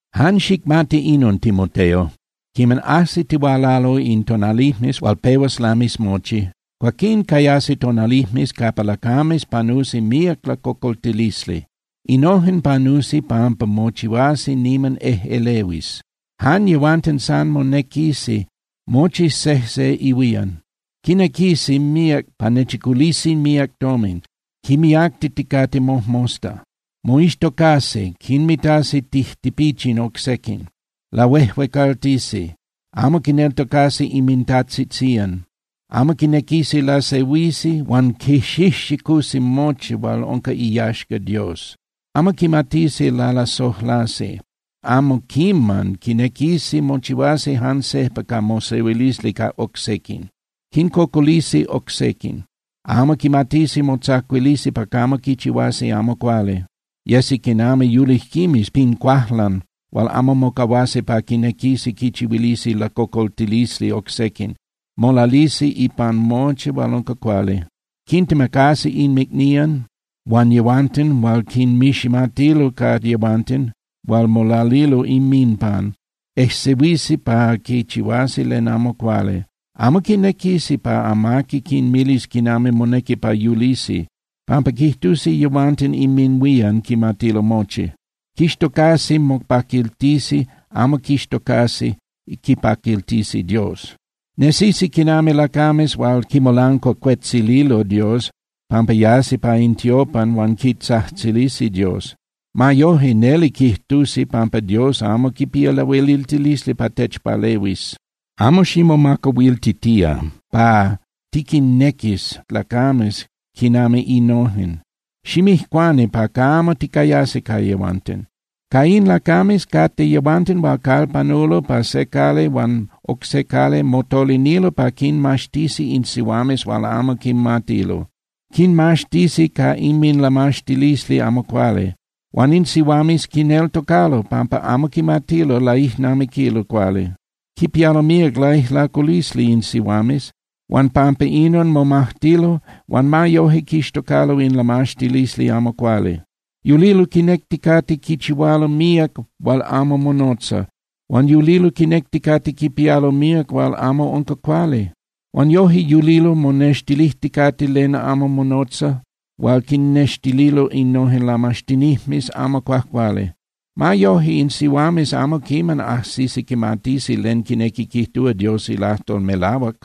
Jan xicmati inon, Timoteo. Quiman ajsitihualalo in tonalijmes hual pehuas lamis mochi, cuaquín cayasi tonalijmes capa lacames panusi míac lacocoltilisli. Innojen panusi pampa mochihuasi niman ejꞌelehuis. Jan yehuanten san monequisi, mochi sejse ihuían. Quinequisi míac pa monechiculisi míac tomin, quimiactiticate mojmosta. Moixtocasi, quinmitasi tijtipichin oc sequin, lahuejuecaltisi, amo quinneltocasi inmintajtzitzían, amo quinequisi lasehuisi, huan quixijxicusi mochi hual unca iyaxca Dios. Amo quimatisi lalasojlasi, amo quiman quinequisi mochihuasi jan sejpa ca mosehuilisli ca oc sequin. Quincocolisi oc sequin, amo quimatisi motzacuilisi pa camo quichihuasi amo cuali, yesi quinami yulijquimes pin cuajlan hual amo mocahuasi pa quinequisi quichihuilisi lacocoltilisli oc sequin, molalisi ipan mochi hual unca cuali. Quintemacasi inmicnían huan yehuanten hual quinmiximatilo ca yehuanten hual molalilo inminpan, ejsehuisi pa quichihuasi len amo cuali, amo quinequisi pa amaqui quinmilis quinami monequi pa yulisi, pampa quijtusi yehuanten inminhuían quimatilo mochi. Quixtocasi mopaquiltisi, amo quixtocasi quipaquiltisi Dios. Nesisi quinami lacames hual quimolancuacuetzililo Dios pampa yasi pa in tiopan huan quitzajtzilisi Dios. Ma yoje, neli quijtusi pampa Dios amo quipía lahueliltilisli pa techpalehuis. Amo ximomacahuiltía pa tiquinnequis lacames quinami innojen, ximijcuani pa camo ticayas ca yehuanten. Ca in lacames cate yehuanten hual calpanulo pa se cali huan oc se cali, motolinilo pa quinmaxtisi in sihuames hual amo quimatilo. Quinmaxtisi ca inminlamaxtilisli amo cuali. Huan in sihuames quineltocalo pampa amo quimatilo laijnamiquilo cuali. Quipialo míac laijlaculisli in sihuames huan pampa inon momajtilo huan ma yoje quixtocalo in lamaxtilisli amo cuali. Yulilo quinecticate quichihualo míac hual amo monotza, huan yulilo quinecticate quipialo míac hual amo unca cuali. Huan yoje yulilo monextilijticate len amo monotza hual quinnextililo innojen lamaxtinijmes amo cuajcuali. Ma yoje, in sihuames amo quiman ajsisi quimatisi len quinequi quijtúa Dios ilajtol melahuac.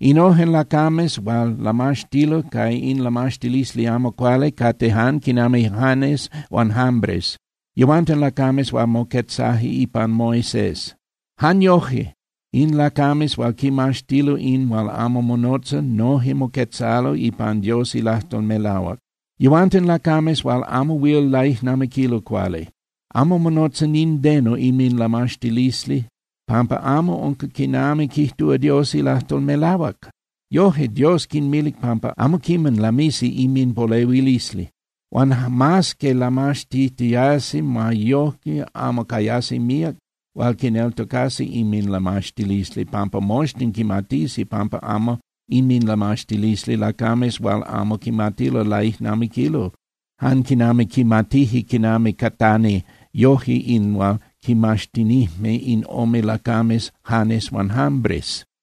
Innojen lacames hual lamaxtilo ca in lamaxtilisli amo cuali cate jan quinami Janes huan Jambres. Yehuanten lacames hual moquetzaje ipan Moisés. Jan yoje in lacames hual quimaxtilo in hual amo monotza noje moquetzalo ipan Dios ilajtol melahuac. Yehuanten lacames hual amo huil laijnamiquilo cuali. Amo monotza nindeno inminlamaxtilisli pampa amo unca quinami quijtúa Dios ilajtol melahuac. Yoje, Dios quinmilic pampa amo quiman lamisi inminpolehuilisli. Huan mas que lamaxtitiasi, ma yojque amo cayasi míac hual quineltocasi inminlamaxtilisli, pampa moxtin quimatisi pampa unca inminlamaxtilisli lacames hual amo quimatilo laijnamiquilo, jan quinami quimatije quinami catani yoje in hual quimaxtinijme in ome lacames Janes huan Jambres.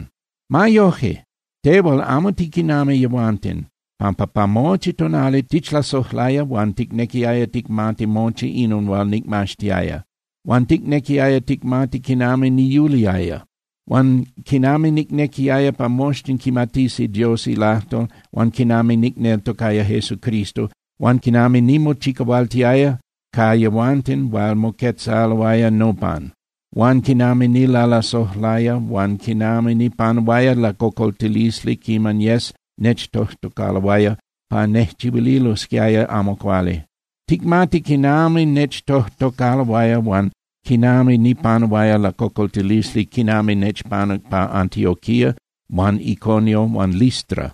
Ma yoje, tehual amo tiquinami yehuanten, pampa pa mochi tonali tichlasojlaya huan ticnequiaya ticmati mochi inon hual nicmaxtiaya, huan ticnequiaya ticmati quinami niyuliaya, huan quinami nicnequiaya pa moxtin quimatisi Dios ilajtol, huan quinami nicneltocaya Jesucristo, huan quinami nimochicahualtiaya ca yehuanten hual moquetzaloaya nopan, huan quinami nilalasojlaya, huan quinami nipanuaya lacocoltilisli quiman yes nechtojtocaloaya pa nejchihuililosquiaya amo cuali. Ticmati quinami nechtojtocaloaya huan quinami nipanuaya lacocoltilisli quinami nechpanuc pa Antioquía huan Iconio huan Listra.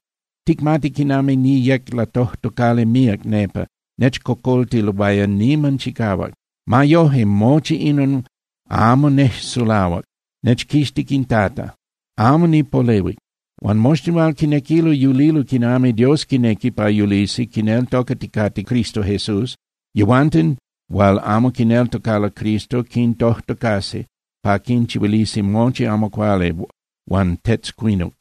Ticmati quinami niyec latojtocali míac nepa, nechcocoltiloaya niman chicahuac. Ma yoje, mochi inon amo nejsulahuac, nechquixtic in Tata, amo nipolehuic. Huan moxtin hual quinequilo yulilo quinami Dios quinequi pa yulisi quineltocaticate Cristo Jesús, yehuanten hual amo quineltocalo Cristo quintojtocasi pa quinchihuilisi mochi amo cuali huan tetzcuinuc.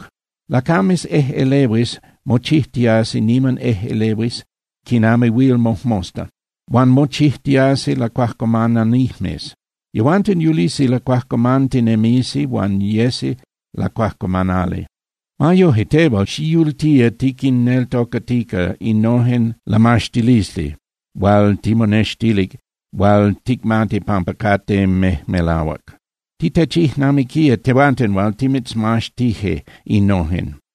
Lacames ejꞌelehuis mochijtiasi niman ejꞌelehuis quinami huil mojmosta, huan mochijtiasi lacuajcuamananijmes. Yehuanten yulisi lacuajcuamantinemisi huan yesi lacuajcuamanali. Ma yoje, tehual, xiyultía tiquinneltocatica innojen lamaxtilisli hual timonextilic hual ticmati pampa cate mejmelahuac. Titechijnamiquía tehuanten hual timitzmaxtije innojen.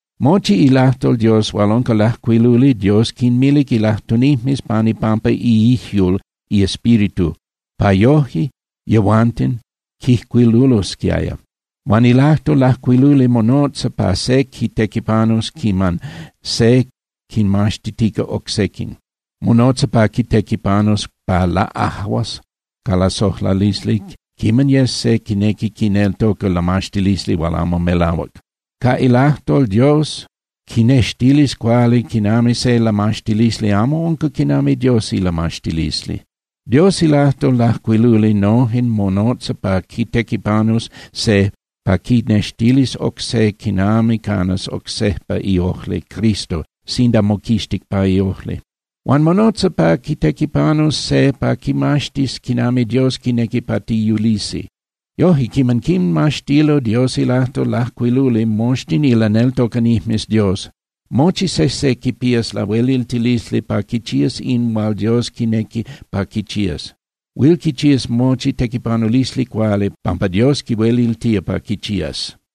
Mochi ilajtol Dios hual unca lajcuiluli Dios quinmilic ilajtunijmes pan ipampa iijyul iEspíritu pa yoje yehuanten quijcuilulosquiaya. Huan ilajtol lajcuiluli monotza pa se quitequipanus quiman se quinmaxtitica oc sequin, monotza pa quitequipanus pa laꞌajuas ca lasojlalisli quiman yes se quinequi quineltoca lamaxtilisli hual amo melahuac. Ca ilajtol Dios quinextilis cuali quinami se lamaxtilisli amo unca quinami Dios ilamaxtilisli. Dios ilajtol lajcuiluli noje monotza pa quitequipanus se pa quinextilis oc se quinami canas oc sejpa iojli Cristo sinda moquixtic pa iojli. Huan monotza pa quitequipanus se pa quimaxtis quinami Dios quinequi pa tiyulisi. Yojque, quiman quinmaxtilo Dios ilajtol lajcuiluli moxtin ilaneltocanijmes Dios, mochi sejse quipías lahueliltilisli pa quichías in hual Dios quinequi pa quichías. Huil quichías mochi tequipanulisli cuali, pampa Dios quihueliltía pa quichías.